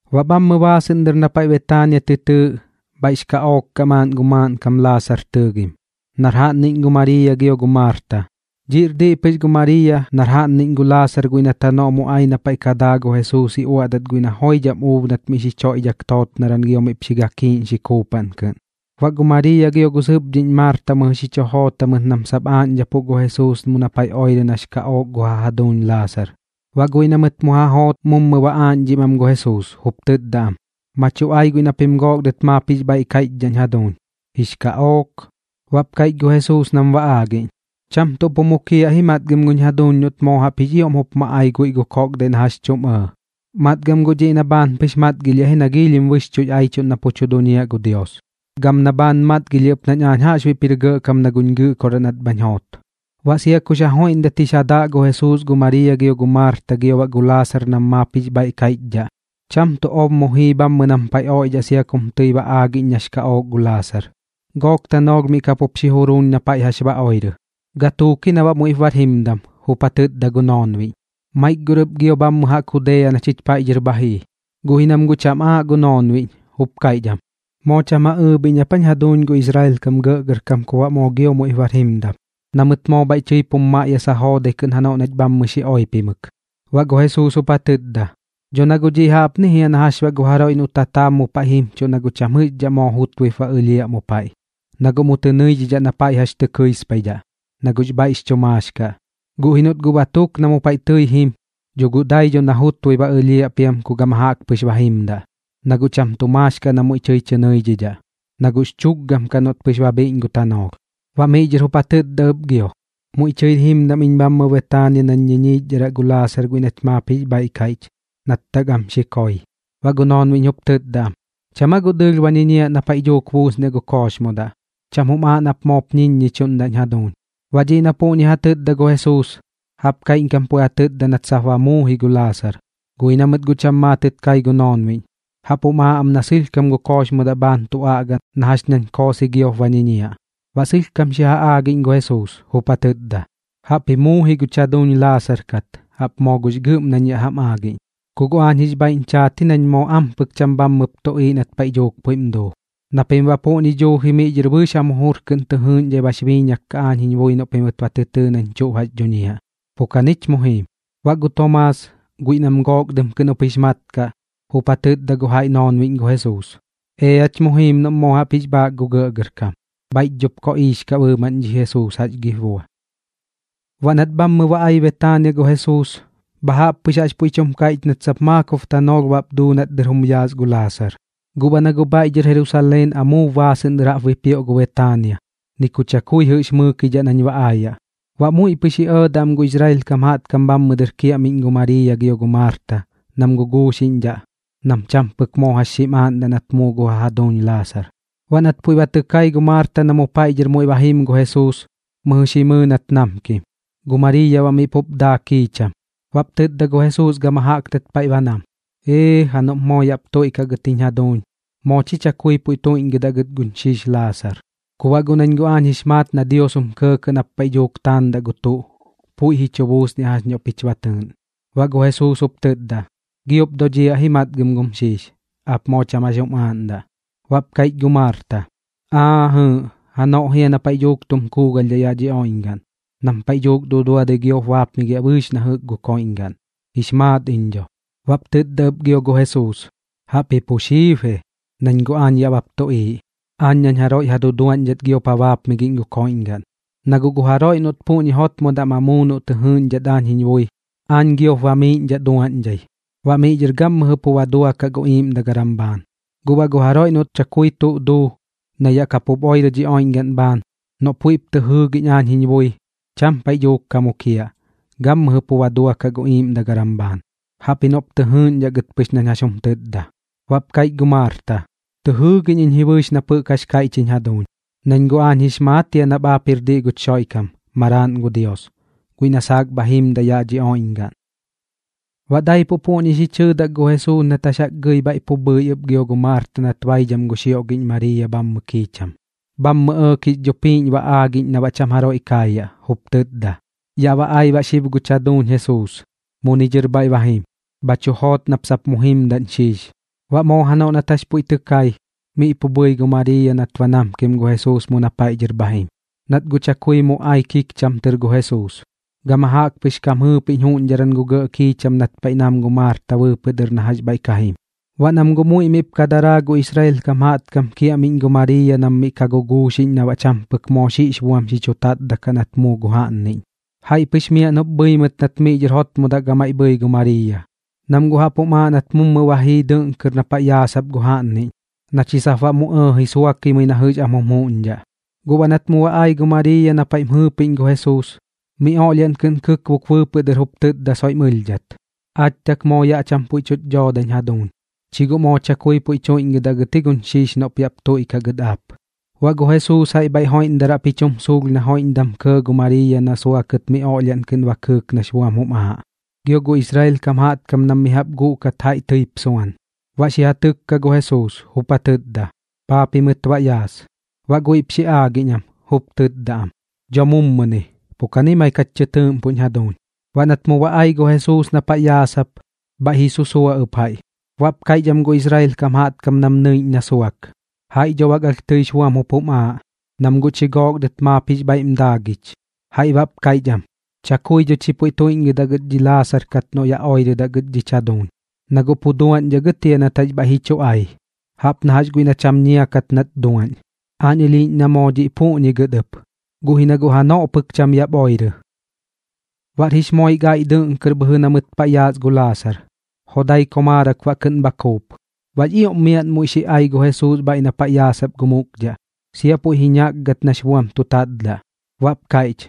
Baꞌ bhammɨ baasɨꞌn dɨr na paiꞌ Betaania tɨ tɨɨꞌ, bhaiꞌx kaꞌook kaꞌ maaꞌn gu maaꞌnkam Laasar tɨɨgim, nar jaꞌnniꞌñ gu Mariiya gio gu Maarta. Dhiꞌr diꞌ pɨx gu Mariiya nar jaꞌnniꞌñ gu Laasar guiꞌ nat janoꞌ mu ai na paiꞌ ka daa gu Jesuus ji uaꞌdat guiꞌ na joidham uub nat miꞌ xi choiꞌdhak tootnaran gio miꞌp xi gakiiꞌñxi kuupaꞌn kɨꞌn. Baꞌ gu Mariiya gio gu sɨpdhiꞌñ Maarta mɨjɨ xi chu joot jamɨt nam sap aaꞌñdhapuꞌ gu Jesuus mu na paiꞌ oirɨ nax kaꞌook gu ja jaduuñ Laasar. Baꞌ guiꞌ na mɨt mu ja joot mummup ba aaꞌñdhim am gu Jesuus, jup tɨtda am: ―Ma chu ai guiꞌ na pim gook dɨt maap jix bhaiꞌ kaiꞌchdhaꞌñ jaduuñ. Jix kaꞌook. Baꞌp kaiꞌch gu Jesuus nam ba aagiꞌñ: ―Cham tuꞌ pu mukiaꞌ ji matgam guñ jaduuñ noꞌt moo jaꞌp jix ioꞌm jup ma ai guiꞌ gu koꞌkdaiꞌ na jax chuꞌm ɇɇ. Matgam guꞌ dhiꞌ na bhaan pɨx matgilhiaꞌ ji na giilhim bɨxchuꞌx aichuꞌn na pu tu duñiaꞌ gu Dios, gam na bhaan matgilhiaꞌ ɨp nañ aañ jaꞌxbuiꞌp jir gɇꞌkam na guñ Gɨꞌkoraꞌ nat bhañ joot. Baꞌ sia kux ja joiꞌndat jix ja daꞌ gu Jesuus gu Mariiya gio gu Maarta gio baꞌ gu Laasar nam maap jix bhaiꞌ kaiꞌchdhaꞌ, cham tuꞌ ob mu jii bhammɨ nam paiꞌ oiꞌdhaꞌ sia kum tɨi ba aagiꞌñ nax kaꞌook gu Laasar. Gook tanoolh miꞌ kapup xi juruuñ na paiꞌ jax ba oirɨ. Gatuuk ji na baꞌ muiꞌp bar jimdam, jup ja tɨtda gu noonbiꞌñ: ―Maik gor ɨp gio bhammɨ jaꞌk Judea na chich paiꞌ dhɨr bha jii. Guꞌ ji nam guꞌ am cham aaꞌ gu noonbiꞌñ, jup kaiꞌch am: ―¿Moo cham ja ɨɨbhiꞌñ ap aa jiñ jaduuñ gu Israel kam gɇꞌgɇrkam kup baꞌ moo gio muiꞌp bar jimdam? Na mɨt moo bhaiꞌ tɨip jum maꞌyasa joodai kɨꞌn janoꞌ nach bhammɨ xi oipimɨk. Baꞌ gu Jesuus jup ja tɨtda: ―Dho na guꞌ dhiꞌ jaꞌpni jia na jax gu jaroiꞌ noꞌ tataab mu paiꞌ jimchuꞌ na cham jɨꞌxdhaꞌ moo jutbuip ba ɨlhiaꞌ mu paiꞌ, na guꞌ mu tɨ nɨidhidhaꞌ na paiꞌ jax tɨ kɨispaidhaꞌ, na guꞌx bhaiꞌx chu maax kaꞌ. Guꞌ ji noꞌt guꞌ ba tuk na mu paiꞌ tɨi jim, dho guꞌ dai dho na jutbui ba ɨlhiaꞌ piam ku gama jaꞌk pɨx ba jimdaꞌ, na guꞌ cham tu maax kaꞌ na muiꞌ tɨi tɨ nɨidhidhaꞌ, na guꞌx chukgam kaꞌ noꞌt pɨx ba bhiꞌñ gu tanoolh. Baꞌ miꞌ dhɨr jup ja tɨtda ɨp gio: ―Muiꞌ tɨir jimdam iñ bhammɨ Betaania nañ ñiñiichdharaꞌ gu Lasaar guiꞌ nach maap jix bhaiꞌ kaiꞌch, nat tak am xi koi. Baꞌ gu noonbiꞌñ jup tɨtda am: ―¿Cham aa guꞌ dɨɨlh ba ñiñiaꞌ paiꞌ na duuk buusniaꞌ gu kooxmodaꞌ? Cham jum aaꞌ nap moop ñiñiichdhaꞌñ jaduuñ. Baꞌ dhiꞌ na puꞌñi ja tɨtda gu Jesuus, jaꞌp kaiꞌñkam puiꞌ ja tɨtda nat sap ba muu ji gu Laasar, guꞌ ji na mɨt guꞌ cham maatɨt kai gu noonbiꞌñ, jaꞌp jum aaꞌ am na sɨlhkam gu kooxmodaꞌ bhaan tu aꞌga na jax nañ koosɨi giop ba ñiñiaꞌ. Baꞌ sɨlhkam xi ja aagiꞌñ gu Jesuus, jup ja tɨtda: ―Jaꞌpji muu ji guch jaduuñ Laasar kat, jaꞌp moo gux gɨꞌm nañ yaꞌ jam aagiꞌñ. Ku guꞌ aañ jix bhaiꞌñ chaat ji nañ moo ampɨk cham bhammɨp tuꞌiiꞌ nat paiꞌ dhuuk puiꞌm duu, na pim baꞌ puꞌñi dhuuji miꞌ dhɨr bɨɨx jam jujur kɨꞌn tɨ jɨɨꞌñdhai bax biiñak kaꞌ aañ jiñ bui noꞌ pimɨt ba tɨ tɨɨ nañ tuꞌ jax dhuñiaꞌ. Pu kanich mu jiim. Baꞌ gu Tomaas, guiꞌ nam Gook Dɨm kɨꞌn jup jix mat kaꞌ, jup ja tɨtda gu jaiꞌ noonbiꞌñ gu Jesuus: ―Each mu jiim noꞌm moo jaꞌp jix bhaak gu gɇꞌgɇrkam. Bhaiꞌch dhop koꞌiix kaꞌ bɨɨmaꞌn dhi Jesuus, ¿jax gip bua? Baꞌ nat bhammɨ ba ai Betaania gu Jesuus, bha jaꞌp pɨx jax puiꞌ tum kaiꞌch nat sap maakob tanoolh bap duu nat dɨr jum yaas gu Laasar. Guꞌ baꞌ na guꞌ bhaiꞌ dhɨr Jerusaleen amuub baasɨꞌn dɨr jaꞌp bipioꞌ gu Betaania, ni ku chakui jɨꞌx mɨɨkidhaꞌ nañ ba aayaꞌ, baꞌ muiꞌ pɨx ji ɇɇdaꞌ am gu Israel kam jaꞌtkam bhammɨ dɨr kiaꞌmiꞌñ gu Mariiya gio gu Maarta nam guguuxiꞌñdhaꞌ nam cham pɨk moo jax xim aaꞌndaꞌ nat muu gu ja jaduuñ Laasar. Baꞌ nat puiꞌ ba tɨ kai gu Maarta na mu paiꞌ dhɨr muiꞌ ba jim gu Jesuus, mɨjɨ xi mɨɨ nat namkim, gu Mariiya baꞌ miꞌ pup daa kiicham. Baꞌp tɨtda gu Jesuus gama jaꞌk nat paiꞌ ba nam: ―¡Ee ja! Noꞌp moo yaꞌp tuiꞌkaꞌ gɨt jiñ jaduuñ, moo chi chakui puiꞌ tuiꞌñgɨdaꞌ gɨt guñ xiix Laasar. Ku baꞌ guꞌ nañ guꞌ aañ jix maat na gu Dios jum kɇɇkɇꞌ nap paiꞌ dhuuk taandaꞌ gu tuꞌ, puiꞌ ji chu buusniaꞌ jax noꞌ pich ba tɨɨꞌn. Baꞌ gu Jesuus jup tɨtda: ―Giop dodhiaꞌ ji matgam gum xiix. Aap moo cham jax jum aaꞌndaꞌ. Baꞌp kaiꞌch gu Maarta: ―Aa jɨɨꞌ, janoꞌ jia na paiꞌ dhuuk tum kuugalhdhaꞌ yaꞌ dhi oiꞌñgaꞌn, nam paiꞌ dhuuk duduadɨi giop baapmigiaꞌ bɨɨx na jɨꞌk gu koiꞌñgaꞌn. Jix maat iñ dho. Baꞌp tɨtda ɨp gio gu Jesuus: ―Jaꞌpji pu xiib ji, nañ guꞌ yaꞌ bap tuꞌiiꞌ, aañ nañ jaroiꞌ ja duduaꞌñdhat giop ja baapmigiꞌñ gu koiꞌñgaꞌn. Na guꞌ gu jaroiꞌ noꞌt puꞌñi jotmodaꞌ ma muu noꞌ tɨ jɨɨꞌñdhat aañ jiñ bui, aañ giop bamiiꞌñdhaꞌ duaꞌñdhai, baꞌ miꞌ dhɨr gammɨjɨ pu ba duakaꞌ gu iiꞌmdagaram bhaan. Guꞌ baꞌ gu jaroiꞌ noꞌt chakui tuꞌ duu, na yaꞌ kapup oirɨ dhi oiꞌñgaꞌn bhaan, noꞌ puiꞌp tɨ jɨɨgiꞌñ aañ jiñ bui, cham paiꞌ dhuuk ka mukiaꞌ, gammɨjɨ pu ba duakaꞌ gu iiꞌmdagaram bhaan, jaꞌpji noꞌp tɨ jɨɨgiꞌñdhaꞌ gɨt pɨx nañ jax jum tɨtda. Baꞌp kaiꞌch gu Maarta: ―Tɨ jɨɨgiꞌñ iñ ji bɨɨx nap jɨꞌk jax kaiꞌch jiñ jaduuñ, nañ guꞌ aañ jix maat jia nap aap jir diꞌ guch Xoiꞌkam, Maraaꞌn gu Dios, guiꞌ na saak bha jimdaꞌ yaꞌ dhi oiꞌñgaꞌn. Baꞌ daipuꞌ puꞌñi xi chɨɨdak gu Jesuus nat jax jaꞌk gɨi bhaiꞌ pu bhɨi ɨp gio gu Maarta nat baidham gu xioꞌgiꞌñ Mariiya bhammɨ kiicham. Bhammɨ ɇɇk jix dhupiiꞌñ ba aagiꞌñ na baꞌ cham jaroiꞌ kaayaꞌ, jup tɨtda: ―Yaꞌ ba ai baꞌ xib guch jaduuñ Jesuus. Muni dhɨr bhaiꞌ ba jim. Bha chu joot nap sap mu jimdaꞌñ xiix. Baꞌ moo janoꞌ nat jax puiꞌ tɨ kai, miꞌ pu bhɨi gu Mariiya nat ba namkim gu Jesuus mu na paiꞌ dhɨr bha jim. Nat guꞌ chakui mu ai kikcham tɨr gu Jesuus, gama jaꞌk pɨx kam jɨɨpiꞌñ juꞌñdharan gu gɇꞌ kiicham nat paiꞌ nam gu Maarta bɨɨpɨꞌ dɨr na jax bhaiꞌ ka jim. Baꞌ nam guꞌ muiꞌ miꞌp ka daraa gu Israel kam jaꞌtkam kiaꞌmiꞌñ gu Mariiya nam miꞌ ka guguuxiꞌñ na baꞌ cham pɨk moo xiꞌx buam xi chu tatdaꞌ kaꞌ nat muu gu jaꞌnniꞌñ, jaiꞌ pɨx miaꞌn jup bhɨi mɨt nat miꞌ dhɨr jotmodaꞌ gamaiꞌ bhɨi gu Mariiya, nam guꞌ jaꞌp jum aaꞌ nat mummu ba jii dɨꞌn kɨr na paiꞌ yaasap gu jaꞌnniꞌñ, na chi sap baꞌ mu ɇɇji suakimɨi na jɨꞌx am jum juꞌñdhaꞌ. Guꞌ baꞌ nat mu ba ai gu Mariiya na paiꞌm jɨɨpiꞌñ gu Jesuus, mi oꞌlhiaꞌn kɨꞌn kɨkbuk bɨɨpɨꞌ dɨr jup tɨtda soiꞌm ɨlhdhat: ―Aach tak moo yaꞌ cham puiꞌ tuꞌch doodañ jaduuñ. Chi guꞌ moo chakui puiꞌ tuiꞌñgɨdaꞌ gɨt ji guñ xiix noꞌp yaꞌp tuiꞌkaꞌ gɨt aap. Baꞌ gu Jesuus jaiꞌ bhaiꞌ joiꞌndaraꞌp ji chum suulh na joiꞌndam kɇɇ gu Mariiya na suakɨt mi oꞌlhiaꞌn kɨꞌn ba kɨɨk nax buam jum aaꞌ, gio gu Israel kam jaꞌtkam nam mi jaꞌp guꞌkat jaiꞌ tɨip suan. Baꞌ xi ja tɨkka gu Jesuus, jup ja tɨtda: ―¿Paa pimɨt baꞌ yaas? Baꞌ guiꞌp xi aagiꞌñ am, jup tɨtda am: ―Dho mummuni. Pu kani maik jach tɨ tɨɨꞌmpuꞌñ jaduuñ. Baꞌ nat mu ba ai gu Jesuus na paiꞌ yaasap, bhaiꞌ ji susua ɨp jaiꞌ. Baꞌ kaiꞌch am gu Israel kam jaꞌtkam nam nɨiꞌñ na suak: ―Jaiꞌ dho bak alh tɨix buam jup jum aaꞌ, nam guꞌ chi gook dɨt maap jix bhaiꞌm daagich. Jaiꞌ baꞌp kaiꞌch am: ―Chakui dho chi puiꞌ tuiꞌñgɨdaꞌ gɨt dhi Laasar kat noꞌ yaꞌ oirɨdaꞌ gɨt dhich jaduuñ, na guꞌ pu duaꞌñdhaꞌ gɨt jia nat jax bhaiꞌ ji chu ai, jaꞌp na jax guiꞌ na cham ñia kat nat duaꞌñ. Aañ ɨlhiiꞌñ na moo dhiꞌ puꞌñi gɨt ɨp, guꞌ ji na guꞌ janoꞌ pɨk cham yaꞌp oirɨ. Baꞌr jix moik aiꞌ dɨꞌn kɨr bhɨjɨ na mɨt paiꞌ yaas gu Laasar, jodai komaarak baꞌ kɨꞌn bha kuup. Baꞌx ioꞌm miaꞌn muiꞌ xi ai gu Jesuus bhaiꞌ na paiꞌ yaasap gu mukdhaꞌ, sia puiꞌ ji ñakgat nax buam tu tatdaꞌ, baꞌp kaiꞌch: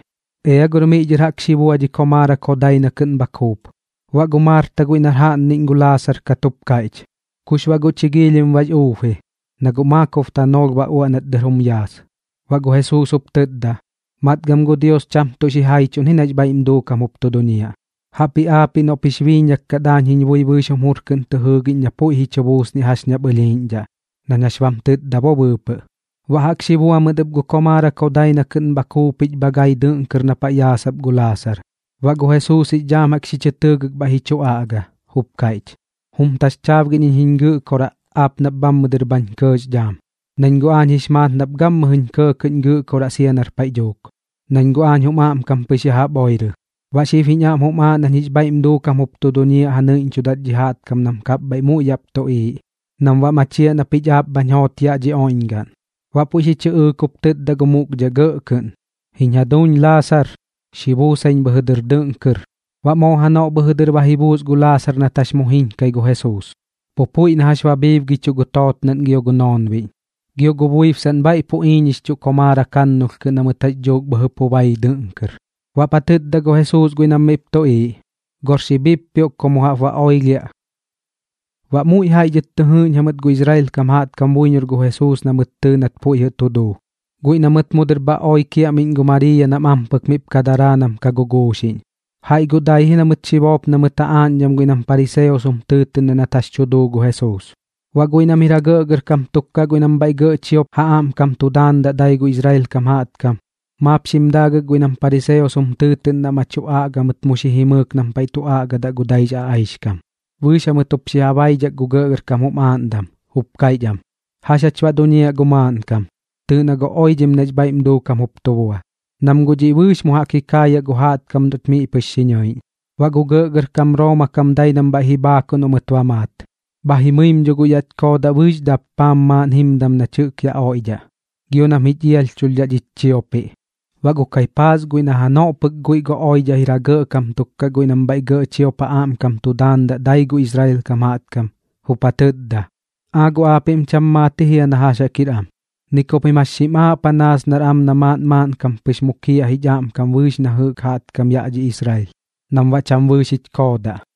―Ea gor miꞌ dhɨr jaꞌk xi bua dhi komaarak jodai na kɨꞌn bha kuup. Baꞌ gu Maarta guiꞌ nar jaꞌnniꞌñ gu Laasar kat, jup kaiꞌch: ―¿Kux baꞌ guꞌ chi giilhim bax uub ji? Na guꞌ maakob tanoolh ba uaꞌ nat dɨr jum yaas. Baꞌ gu Jesuus jup tɨtda: ―Matgam gu Dios cham tuꞌ xijaichuꞌn ji nax bhaiꞌm duukam jup tu duñiaꞌ. Jaꞌpji aapiꞌ noꞌp jix biiñak kat aañ jiñ bui bɨɨx jum jur kɨꞌn tɨ jɨɨgiꞌñ na puiꞌ ji chu buusniaꞌ jax ñap ɨlhiiꞌñdhaꞌ, nañ jax bam tɨtda bo bɨɨpɨꞌ. Baꞌ jaꞌk xi bua mɨt ɨp gu komaarak jodai na kɨꞌn bha kuupich bha gai dɨꞌn kɨr na paiꞌ yaasap gu Laasar. Baꞌ gu Jesuus jix dhaam jaꞌk xi chɨ tɨɨgɨk bhaiꞌ ji chu aꞌga, jup kaiꞌch: ―Jum taxchaabgiꞌñ iñ jiñ Gɨꞌkoraꞌ, aap nap bhammɨ dɨr bhañ kɇɇx dhaam. Nañ guꞌ aañ jix maat nap gammɨjɨñ kɇɇkɇꞌñ Gɨꞌkoraꞌ sia nar paiꞌ dhuuk, nañ guꞌ aañ jum aꞌmkam pɨx ya jaꞌp oirɨ. Baꞌ xib jiñ aꞌm jum aaꞌ nañ jix bhaiꞌm duukam jup tu duñiaꞌ ja nɨiꞌñchudat dhi jaꞌtkam nam kapbhaiꞌ muiꞌ yaꞌp tuꞌiiꞌ, nam baꞌ machiaꞌ na pich aap bhañ joot yaꞌ dhi oiꞌñgaꞌn. Baꞌ puiꞌ xi chɨꞌɨɨk jup tɨtda gu mukdhaꞌ gɇꞌ kɨꞌn: ―¡Jiñ jaduuñ Laasar, xi buusaiñ bhɨjɨ dɨr dɨꞌn kɨr! Baꞌ moo janoꞌ bhɨjɨ dɨr ba ji buus gu Laasar nat jax mu jiñkai gu Jesuus, pu puiꞌ na jax ba bhiibgichuꞌ gu tootnaꞌn gio gu noonbiꞌñ, gio gu buibsaꞌn bhaiꞌ pu iiñixchuꞌ komaarak jannulh kɨꞌn na mɨt jax dhuuk bhɨjɨ pu bai dɨꞌn kɨr. Baꞌp ja tɨtda gu Jesuus guiꞌ nam miꞌp tuꞌiiꞌ: ―Gor xi bhippioꞌk ku mu jaꞌp baꞌ oilhiaꞌ. Baꞌ muiꞌ jaiꞌ dhɨt tɨ jɨɨꞌñ jamɨt gu Israel kam jaꞌtkam buiñor gu Jesuus na mɨt tɨɨ nat puiꞌ jɨꞌ tu duu, guiꞌ na mɨt mu dɨr bha oi kiaꞌmiꞌñ gu Mariiya nam ampɨk miꞌp ka daraa nam ka guguuxiꞌñ. Jaiꞌ guꞌ dai ji na mɨt xi boop na mɨt ja aaꞌñdham guiꞌ nam pariseos jum tɨɨtɨꞌndaꞌ nat jax tu duu gu Jesuus. Baꞌ guiꞌ nam jir ja gɇꞌgɇrkam tuk kaꞌ guiꞌ nam bhaiꞌ gɇꞌ chiop ja aꞌmkam tu daandaꞌ dai gu Israel kam jaꞌtkam, maap xim daagɨk guiꞌ nam pariseos jum tɨɨtɨꞌndaꞌ ma tu aꞌga mɨt mu xi jimɨɨk nam paiꞌ tu aꞌgadaꞌ gu daix aꞌaixkam, bɨɨx jamɨt jup xi ja baidhak gu gɇꞌgɇrkam jum aaꞌndam, jup kaiꞌch am: ―¿Jax jach baꞌ duñiaꞌ gu maaꞌnkam? Tɨɨꞌ na guꞌ oidhim nax bhaiꞌm duukam jup tu bua. Nam guꞌ dhiꞌ bɨɨx mu jaꞌk ji kaayaꞌ gu jaꞌtkam noꞌch miꞌ pɨx xi ñɨiꞌñ. Baꞌ gu gɇꞌgɇrkam Rooma kam dai nam bhaiꞌ ji bhaakuꞌ noꞌ mɨt ba maat, bha jimɨim dho guꞌ yaꞌch koodaꞌ bɨɨx dappaam maaꞌn jimdam nach jɨꞌk yaꞌ oiꞌdhaꞌ, gio nam jich ialhchulhdhaꞌ dhich chiopiꞌ. Baꞌ gu Kaipaas guiꞌ na janoꞌ pɨk guiꞌ gu oidhaꞌ jir ja gɇꞌkam tuk kaꞌ guiꞌ nam bhaiꞌ gɇꞌ chiop ja aꞌmkam tu daandaꞌ dai gu Israel kam jaꞌtkam, jup ja tɨtda: ―¿Aa guꞌ aapiꞌm cham maat ji jia na jax jaꞌk jir am? Ni ku pim jax xim aaꞌ panaas nar am na maaꞌn maaꞌnkam pɨx mukiaꞌ jich aꞌmkam bɨɨx na jɨꞌk jaꞌtkam yaꞌ dhi Israel, nam baꞌ cham bɨɨx jich koodaꞌ.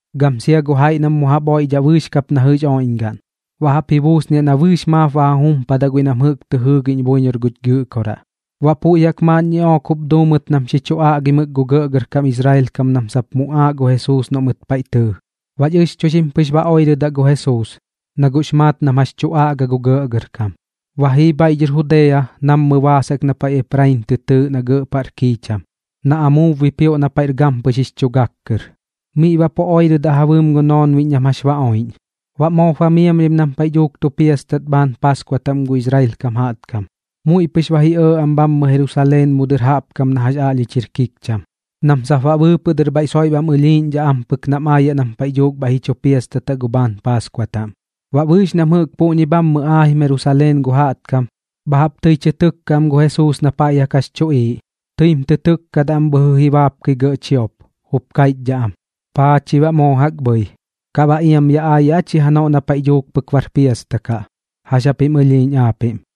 gam sia gu jaiꞌ nam mu jaꞌp oiꞌdhaꞌ bɨɨx kap na jɨꞌx oiꞌñgaꞌn, baꞌ jaꞌp ji buusniaꞌ na bɨɨx maap ba ja jumpadaꞌ guiꞌ nam jɨꞌk tɨ jɨɨgiꞌñ buiñor guch Gɨꞌkoraꞌ. Baꞌ puiꞌ jaꞌk maaꞌn ñiꞌook jup duu mɨt nam xi chu aꞌgimɨk gu gɇꞌgɇrkam Israel kam nam sap muꞌaaꞌ gu Jesuus noꞌ mɨt paiꞌ tɨɨ. Baꞌx ɨxchuixim pɨx ba oirɨdaꞌ gu Jesuus, na guꞌx maat nam jax tu aꞌga gu gɇꞌgɇrkam. Ba jii bhaiꞌ dhɨr Judea nammɨ baas jaꞌk na paiꞌ Eprain tɨ tɨɨꞌ na gɇꞌ paꞌr kiicham, na amuub bipioꞌ na paiꞌr gampɨx jix chu gak kɨr. Miꞌ baꞌ pu oirɨdaꞌ ja bɨɨm gu noonbiꞌñ nam jax ba oiꞌñ. Baꞌ moop ba miamlhim nam paiꞌ dhuuk tu piastatdaꞌ bhaan paaskua taꞌm gu Israel kam jaꞌtkam. Muiꞌ pɨx ba ji ɇɇ am bhammɨ Jerusaleen mu dɨr jaꞌp kam na jax aꞌlhich jir kikcham, nam sap baꞌ bɨɨpɨꞌ dɨr bhaiꞌ soiꞌ bam ɨlhiiꞌñdhaꞌ ampɨk nam aayaꞌ nam paiꞌ dhuuk bhaiꞌ ji chu piastataꞌ gu bhaan paaskua taꞌm. Baꞌ bɨɨx nam jɨꞌk puꞌñi bhammɨ aajim Jerusaleen gu jaꞌtkam, bha jaꞌp tɨi tɨ tɨkkaꞌ am gu Jesuus na paiꞌ jaꞌk jax chuꞌiiꞌ. Tɨim tɨ tɨkkadaꞌ am bhɨjɨ ji baapkɨ gɇꞌ chiop, jup kaiꞌchdhaꞌ am: ―¿Paa chi baꞌ moo jaꞌk bhɨi? ¿Kaꞌ baꞌ iam yaꞌ aayaꞌ aa chi janoꞌ na paiꞌ dhuuk pɨk bar piasta kaꞌ? ¿Jax japim ɨlhiiꞌñ aapiꞌm?